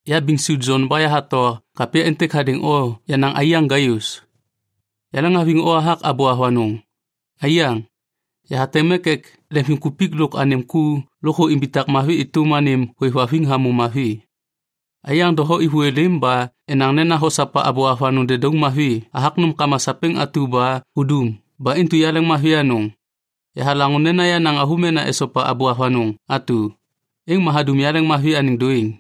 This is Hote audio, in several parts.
Ya Biŋsu Jon ba yahato kapya êntêk hadêŋ o yenaŋ aiyaŋ Gaius. Yaleŋhaviŋ o hathak abô avanôŋ. Aiyaŋ, yahateŋ mek ek lemvimkupik lôk anêm ku lôkthô imbitak mavi êtôm anêm hôêvhaviŋ hamô mavi. Aiyaŋ doho êvô êlêm ba enaŋ nena hosopa abô avanôŋ dedauŋ mavi hathak nômkama sapêŋ atu ba hudum ba intu yaleŋmavi anôŋ. Yahalaŋô nena yenaŋ avômena esopa abô avanôŋ atu, êŋ ma hadum yaleŋmavi anêŋ dôêŋ.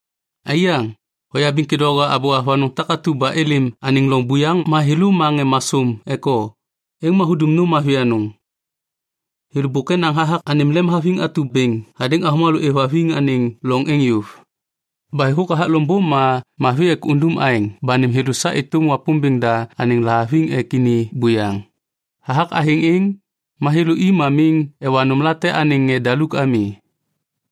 Aiyaŋ, hoyabiŋ kêdôŋwaga abô avanôŋ takatu ba êlêm anêŋ loŋ buyaŋ ma thêlô ma ŋê masôm ek o, êŋ ma hudum nôm mavi anôŋ. Thêlô bôk enaŋ hathak anêm lemhaviŋ atu bêŋ hadêŋ avômalô êvhaviŋ anêŋ loŋ êŋ yôv. Ba êthôk hathak loŋbô ma mavi ek undum aêŋ ba nêm thêlô sa êtôm Wapômbêŋ da anêŋ lahaviŋ ek ini buyaŋ. Hathak athêŋ êŋ, ma thêlô i ma miŋ ewa nômlate anêŋ ŋê daluk ami.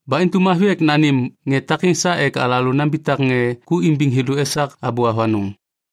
Ba intu mavi ek nanêm ŋê takêŋ sa ek alalô nambitak ŋê ku imbiŋ thêlô esak abô avanôŋ.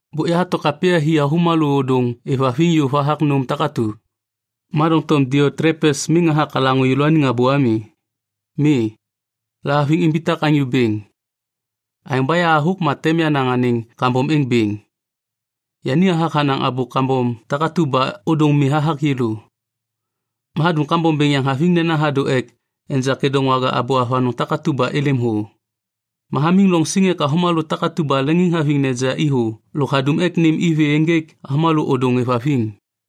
Bôk yahato kapya hi avômalô ôdôŋ êvhaviŋ yôv hathak nôm takatu, ma doŋtom Diotlepes miŋ hathak halaŋô yêlôaniŋ abô ami. Mi, lahaviŋ imbitak anyô bêŋ. Aêŋ ba yahathôk ma tem yanaŋ anêŋ kambom êŋ bêŋ. Yani hathak hanaŋ abô kambom takatu ba ôdôŋ mi hathak yêlô. Ma hadum kambom bêŋ yaŋ haviŋ nena hadô ek enja kêdôŋwaga abô avanôŋ takatu ba êlêm thô. Ma hamiŋ loŋ siŋ ek avômalô takatu ba leŋiŋhaviŋ neja i thô lôk hadum ek nêm i vê ênjêk avômalô ôdôŋ êvhaviŋ.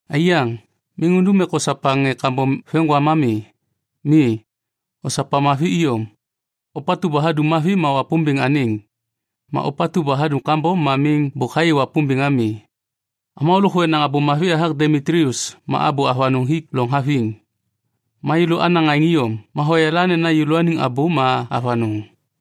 Aiyaŋ, miŋ undum ek osopa ŋê kambom veŋiŋgwam ami. Mi, osopa mavi iyom. Ôpatu ba hadum mavi ma Wapômbêŋ anêŋ. Ma ôpatu ba hadum kambom ma miŋ bôk hayê Wapômbêŋ ami. Avômalô lôkthô enaŋ abô mavi hathak Demitlius ma abô avanôŋ hik loŋ haviŋ. Ma yêlô anaŋ aêŋ iyom ma hoyala nena yêlôaniŋ abô ma avanôŋ.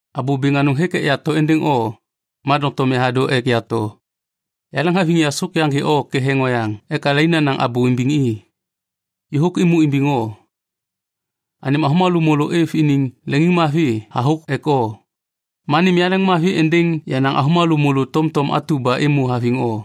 Abô bêŋ anôŋ hêk ek yato êndêŋ o, ma doŋtom yahadô ek yato. Yaleŋhaviŋ yasôk yaŋgê o ketheŋ oyaŋ ek alai nanaŋ abô imbiŋ i. Yôhôk êmô imbiŋ o. Anêm avômalô môlô êv iniŋ leŋiŋmavi hathôk ek o. Ma nêm yaleŋmavi êndêŋ yenaŋ avômalô môlô tomtom atu ba êmô haviŋ o.